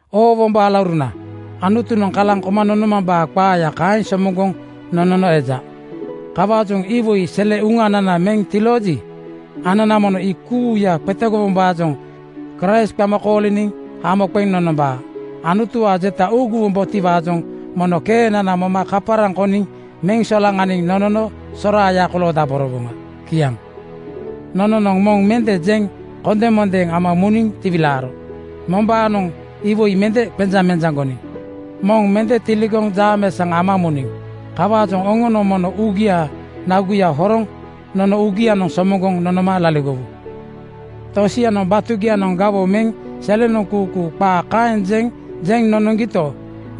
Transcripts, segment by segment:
Oo wombo alauruna, Anutunoŋ kalaŋ koma nonomambaa qaaya kaeŋ somoŋgoŋ nonono eja. Kawaajoŋ iwoi sele uŋanana meŋ tilooji, anana mono ii kuuya qetegowombaajoŋ Kraist qama kooliniŋ hamo qeŋ nonombaa. Anutuwaa jeta uuguwombotiwaajoŋ mono keenana moma kaparaŋ koniŋ meŋ solaŋaniŋ nonono soraaya koloodaborowoŋa. Kiaŋ. Nononoŋ moŋ mende jeŋ kondemondeeŋ ama muniŋ tiwilaaro. Mombaanoŋ iwoi mende qenjamenjaŋgoniŋ. Moŋ mende tiligoŋ jaameesaŋ ama muniŋ. Kawaajoŋ oŋonoŋ mono uugiaa naguya horoŋ nono uugianoŋ somoŋgoŋ nonoma laligowu. Tosianoŋ batugianoŋ gawoŋ meŋ selenoŋ kuukuu qaa kaeŋ jeŋ jeŋ nonoŋgito,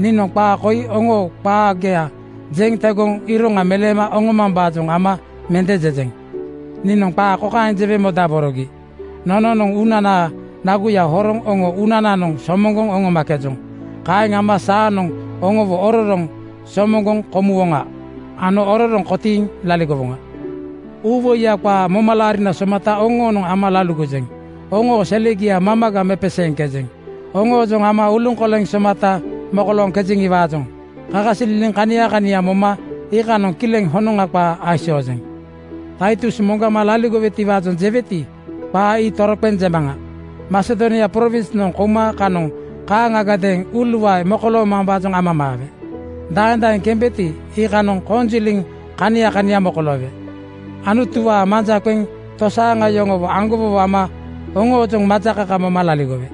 niinoŋ qaa koi oŋoo qaagia jeŋ tegoŋ iroŋa meleema oŋomambaajoŋ ama mende jejeŋ. Niinoŋ qaa kokaeŋ jewe modaborogi: Nononoŋ uunanaa naguya horoŋ oŋo uunananoŋ somoŋgoŋ oŋomakejoŋ. Kaeŋ ama saanoŋ oŋowo ororoŋ somoŋgoŋ komuwoŋa ano ororoŋ kotiiŋ laligowoŋa. Uuwoiya qaa momalaarina somata oŋoonoŋ ama laligojeŋ. Oŋoo selegia mamaga mepeseeŋkejeŋ. Oŋoojoŋ ama uluŋkolena somata mokoloojeŋiwaajoŋ kakasililiŋ kania kania moma iikanoŋ kileŋ honoŋa qaa aisoojeŋ. Taitus moŋgama laligowetiwaajoŋ jeweti, qaa ii toroqeŋ jemaŋa. Masedonia prowinsnoŋ kouma kanoŋ kaaŋagadeeŋ uuluae mokoloomambaajoŋ amamaawe. Daeŋ daeŋ kembeti, iikanoŋ konjiliŋ kania kania mokoloowe. Anutuwaa manja qeŋ tosaaŋa yoŋowo aŋgowowo ama oŋoojoŋ majakaka moma laligowe.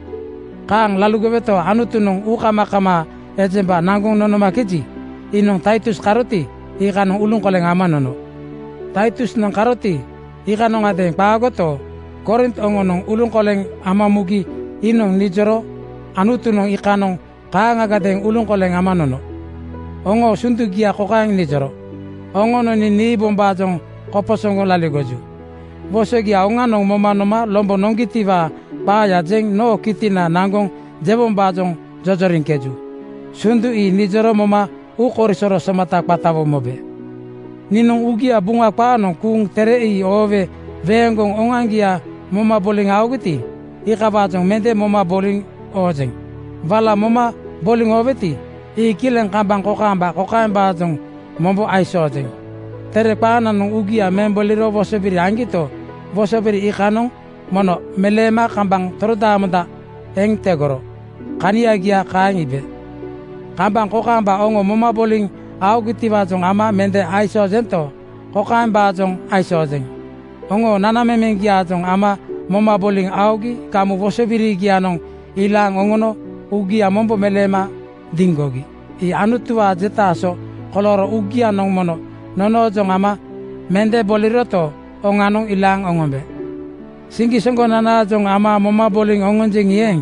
Kaaŋ laligoweto, Anutunoŋ uukamakamaa ejemba naŋgoŋ nonomakeji, iinoŋ Taitus karoti, iikanoŋ uluŋkoleŋ ama nono. Taitusnoŋ karoti, iikanondeeŋ qaagoto, Korint oŋonoŋ uluŋkoleŋ ama mugi iinoŋ nijoro Anutunoŋ iikanoŋ kaaŋagadeeŋ uluŋkoleŋ ama nono. Oŋoo sundugia kokaeŋ nijoro, “Oŋonoŋ nii niibombaajoŋ koposoŋgoŋ laligoju. Wosogia oŋanoŋ moma noma lombo noŋgitiwaa qaaya jeŋ noo kitina naŋgoŋ jewombaajoŋ jojoriŋkeju.” Sundu ii nijoro moma uukoisoro somata qatawo mobe. Niinoŋ uugia Buŋa qaanoŋ kuuŋ tere ii oowe weeŋgoŋ oŋoaŋgia moma boliŋ aogiti, iikawaajoŋ mende moma boliŋ aojeŋ. Wala moma boliŋ aoweti, ii kileŋ kambaŋ kokaamba kokaembaajoŋ mombo aisoojeŋ: Tere qaananoŋ uugia meŋ boliro wosobiri aŋgito, wosobiri iikanoŋ mono meleema kambaŋ torodaamonda eŋ tegoro. Kaniagia kaeŋ iibe. Kambaŋ kokaamba oŋo moma boliŋ aogitiwaajoŋ ama mende aisoojento, kokaembaajoŋ aisoojeŋ: Oŋo nanamemeŋgiaajoŋ ama moma boliŋ aogi gamu wosobirigianoŋ ilaaŋ oŋono uugia mombo meleema diŋgogi. Ii Anutuwaa jetaa so kolooro uugianoŋ mono nonoojoŋ ama mende boliroto, oŋanoŋ ilaaŋ oŋombe. Siŋgisoŋgonanaajoŋ ama moma boliŋ aojoŋi eeŋ,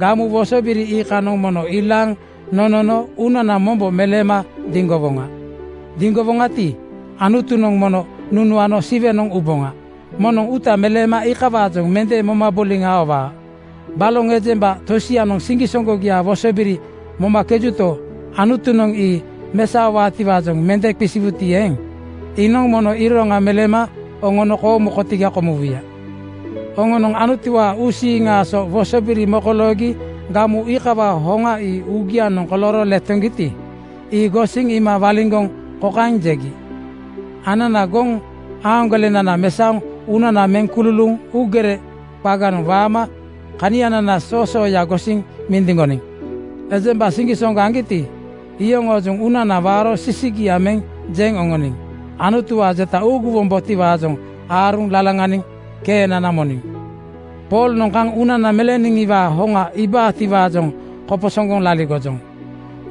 gamu wosobiri iikanoŋ mono ilaaŋ nonono uunana mombo meleema diŋgowoŋa. Diŋgowoŋati, Anutunoŋ mono nunuano Siwenoŋ uboŋa. Moŋnoŋ uuta meleema iikawaajoŋ mende moma boliŋ aowaa. Baloŋ ejemba tosianoŋ siŋgisoŋgogiaa wosobiri momakejuto, Anutunoŋ ii mesaowaatiwaajoŋ mende qisiwuti eeŋ, iinoŋ mono iroŋa meleema oŋono koomu kotiga kumuwuya. Oŋonoŋ Anutuwaa uusiiŋaa so wosobiri mokoloogi gamu iikawaa hoŋa ii uugianoŋ kolooro letoŋgiti, ii gosiŋ iima waliŋgoŋ kokaeŋ jegi, “Anana goŋ-aaŋgolenana mesaoŋ uunana meŋ kululuuŋ uugere qaganoŋ waama kanianana soosooya gosiŋ mindiŋgoniŋ. Ejemba siŋgisoŋgo aŋgiti, iyoŋoojoŋ uunana waaro sisigia meŋ jeŋ oŋoniŋ. Anutuwaa jeta uuguwombotiwaajoŋ aaruŋ lalaŋaniŋ keenana moniŋ. Poolnoŋ kaŋ uunana meleeniŋiwaa hoŋa iibaatiwaajoŋ koposoŋgoŋ laligojoŋ.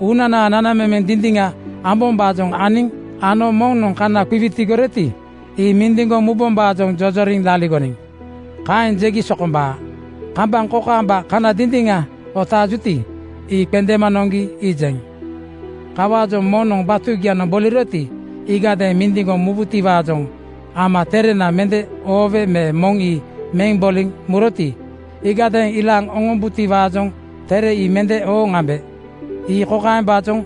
Uunana nanamemeŋ dindiŋa ambombaajoŋ aniŋ ano moŋnoŋ kana qiwitigoroti, ii mindiŋgoŋ mubombaajoŋ jojoriŋ laligoniŋ.” Kaeŋ jegi sokombaa. Kambaŋ kokaamba kana dindiŋa otaajuti, ii qendeema noŋgi iijeŋ. Kawaajoŋ moŋnoŋ batugianoŋ boliroti, iigadeeŋ mindiŋgoŋ mubutiwaajoŋ ama terena mende oowe me moŋ ii meŋ boliŋ muroti, iigadeeŋ ilaaŋ oŋombutiwaajoŋ tere ii mende ooŋ ambe. Ii kokaembaajoŋ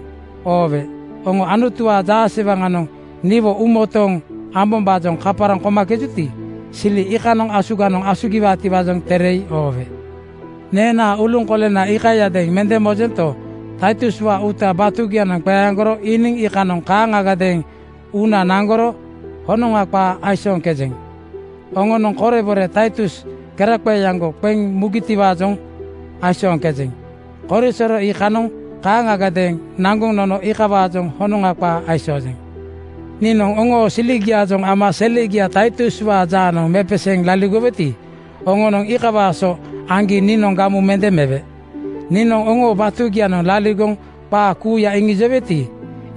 oowe: Oŋo Anutuwaa jaasewaŋanoŋ niwo uumotooŋ ambombaajoŋ kaparaŋ komakejuti, sili iikanoŋ asuganoŋ asugiwaatiwaajoŋ tere ii oowe. Neenaa uluŋkolena iikayadeeŋ mende mojento, Taituswaa uuta batugianoŋ qeaŋgoro iiniŋ iikanoŋ kaaŋagadeeŋ uuna naŋgoro honoŋa qaa aisooŋkejeŋ. Oŋonoŋ korebore Taitus keraqeeaŋgo qeŋ mugitiwaajoŋ aisooŋkeji, korisoro iikanoŋ kaaŋagadeeŋ naŋgoŋ nono iikawaajoŋ honoŋa qaa aisoojeŋ. Niinoŋ oŋoo siligiaajoŋ ama selegia Taituswaa jaanoŋ mepeseeŋ laligoweti, oŋonoŋ iikawaa so aŋgi niinoŋ gamu mende mewe. Niinoŋ oŋoo batugianoŋ laligoŋ qaa kuuya iŋijoweti,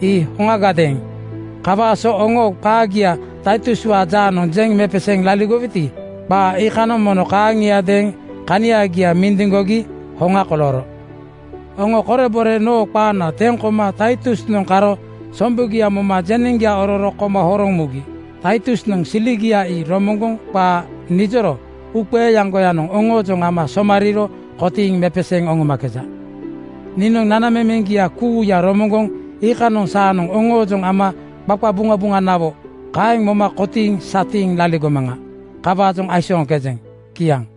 ii hoŋagadeeŋ. Kawaa so oŋoo qaagia Taituswaa jaanoŋ jeŋ mepeseeŋ laligoweti, qaa iikanoŋ mono kaaŋiadeeŋ kaniagia mindiŋgogi hoŋa kolooro. Oŋo korebore noo qaana teŋ koma Taitusnoŋ karo sombugiawo moma jeneŋgia ororo koma horoŋ mugi. Taitusnoŋ siligia ii romoŋgoŋ qaa nijoro uuqeeaŋgoyanoŋ oŋoojoŋ ama somariiro kotiiŋ mepeseeŋ oŋomakeja. Niinoŋ nanamemeŋgia kuuya romoŋgoŋ iikanoŋ saanoŋ oŋoojoŋ ama qaqabuŋabuŋanawo kaeŋ moma kotiiŋ satiiŋ laligomaŋa. Kawaajoŋ aisooŋkejeŋ. Kiaŋ.